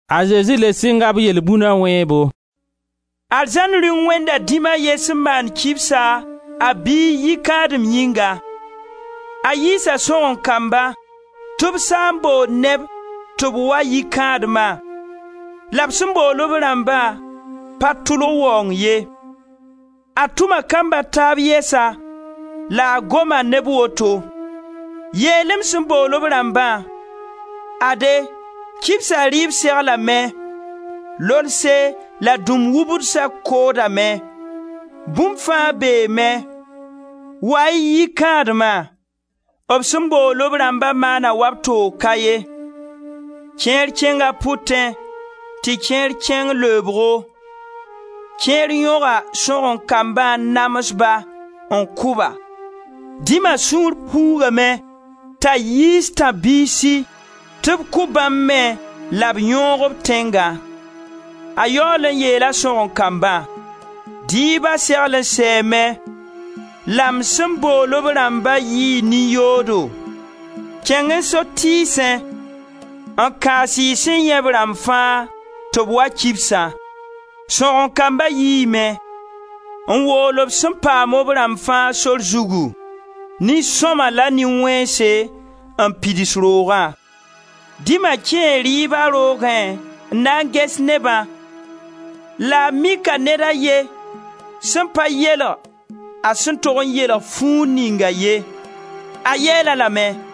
A Zezi le sɩnga b yelbũna wẽebo: «Arzãn Rĩung wẽnda dĩm a ye sẽn maan kibsa, a biig yikãadem yĩnga. A yiisa sõgen-kamba tɩ b saa n bool neb tɩ b wa yikãadma la b sẽn bool b rãmba pa tʋlg waoong ye. A tʋma kamb a taab yɛsa la a goma ne b woto: ‹Yeel-y m sẽn bool b rãmbã: Ade, kibsa rɩɩb seglame: lolse la dũm-wubdsa koodame, bũmb fãa beeme, wa-y yikãadma!› B sẽn bool b rãmba maana wa b toog ka ye. Kẽer kẽng a b pʋtẽ, tɩ kẽer kẽng leebgo. Kẽer yõga sõgen-kambã n nams-ba, n kʋ-ba. Dĩma sũur puugame t'a yiis tãb-biisi tɩ b kʋ bãmb me la b yõog b tẽnga. A yaool n yeela sõgen-kambã: ‹Dɩɩba segl n sɛɛme, la m sẽn bool b rãmba yɩɩ nin-yoodo. Kẽng-y sotiisẽ, n kãas y sẽn yãe b rãmb fãa tɩ b wa kibsã.› Sõgen-kamba yiime, n wool b sẽn paam b rãmb fãa sor zugu, nin-sõma la nin-wẽnse, n pids roogã. Dɩma kẽe rɩɩba roogẽ n na n ges nebã la a mika ned a ye sẽn pa yeelg a sẽn tog n yeelg fuug ninga ye. A yeel-a lame: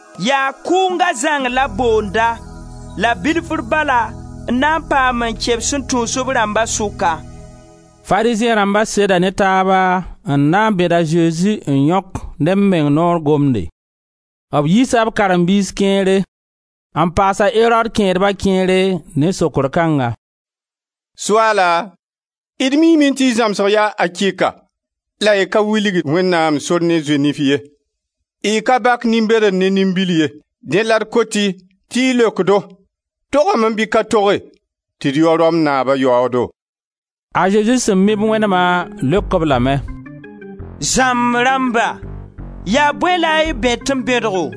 Yaa kʋʋnga zãng la b boonda la bilfr bala n na n paam n kẽ b sẽn tũus b rãmba sʋka.» Farizẽ rãmba seda ne taaba n na bẽd a Zezi n yõk ne b meng noor gomde. B yiisa b karen-biis kẽere, n paas a Erod kẽedba kẽere, ne sokr kãnga: «Soaala, d miime tɩ y zãmsg yaa akɩka la y ka wilgd Wẽnnaam sor ne zoe-nif ye. Y ka bak nin-bedr ne nin-bil ye, dẽ la d kot tɩ y leok-do: togame bɩ ka toge tɩ d yao Rom naaba yaoodo?» A Zezi sẽn mi b wẽnema leok-b lame: «Zãmb rãmba yaa bõe la y bẽt-m bẽdgo?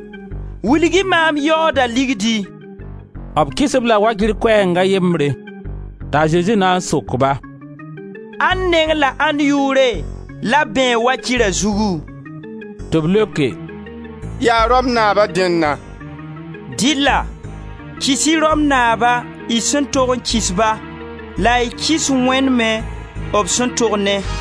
Wilg-y maam yaooda ligdi!» B kɩs-b la wakɩr koɛɛng a yembre. T'a Zezi na n sok-ba: «Ãnd neng la ãnd yʋʋre la b bẽeg wakɩra zugu?» Tɩ b leoke: «Yaa Rom naaba dẽnna!» Dɩlla, kɩs-y Rom naaba, y sẽn tog n kɩs-ba, la y kɩs Wẽnd me b sẽn tog ne.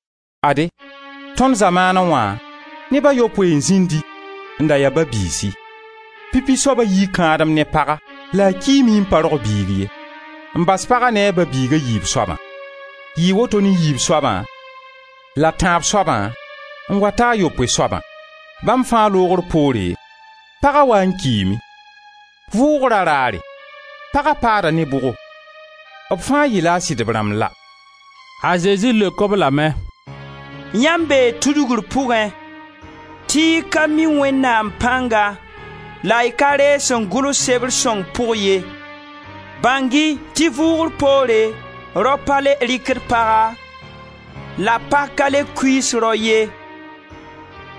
Ade, tõnd zamaanẽ wã neb a yopoe n zĩndi n da ya ba-biisi. Pipi soaba yii kãadem ne paga la a kiime n pa rog biig ye, n bas paga ne a ba-biig a yiib soabã. Yɩɩ woto ne yiib soabã, la tãab soabã n wa ta a yopoe soabã. Bãmb fãa loogr poore, paga waa n kiime. Vʋʋgra raare, paga paada ne bʋgo, b fãa yɩla a sɩdb rãmb la?» A Zezi leok-b lame: «Yãmb bee tudgr pʋgẽ tɩ y ka mi Wẽnnaam pãnga la y ka reeg sẽn gʋls sebr sõng pʋg ye. Bãng-y tɩ vʋʋgr poore rao pa le rɩkd paga, la pag ka le kuiis rao ye,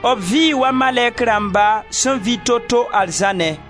b vɩɩ wa malɛk rãmba sẽn vɩ toto arzãnẽ.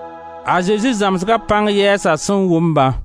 A Zezi zãmsga pãng yɛɛsa sẽn wʋm-bã.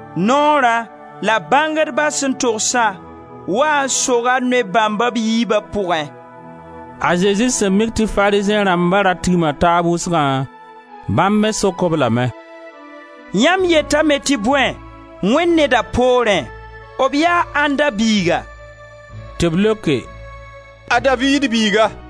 Noora la bãngdba sẽn togsa waa n soga noy bãmba b yiibã pʋgẽ.» A Zezi sẽn mik tɩ Farizẽ rãmba ra tigma taab wʋsgã, bãmb me sok-b lame: «Yamb yetame tɩ bõe, Wẽnd Nedã poorẽ? B yaa ãnda biiga?» Tɩ b leoke: «A Daviid biiga.»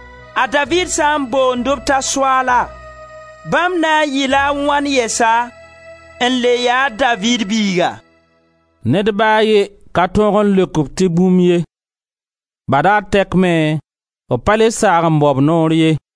A Daviid sã n boond-b t'a Soaala, bãmb na n yɩ-la a wãn yɛsa n le yaa a Daviid biiga?» Ned ba a ye ka tõog n leok-b tɩ bũmb ye. Badaar tɛk me, b pa le saag n bao b noor ye.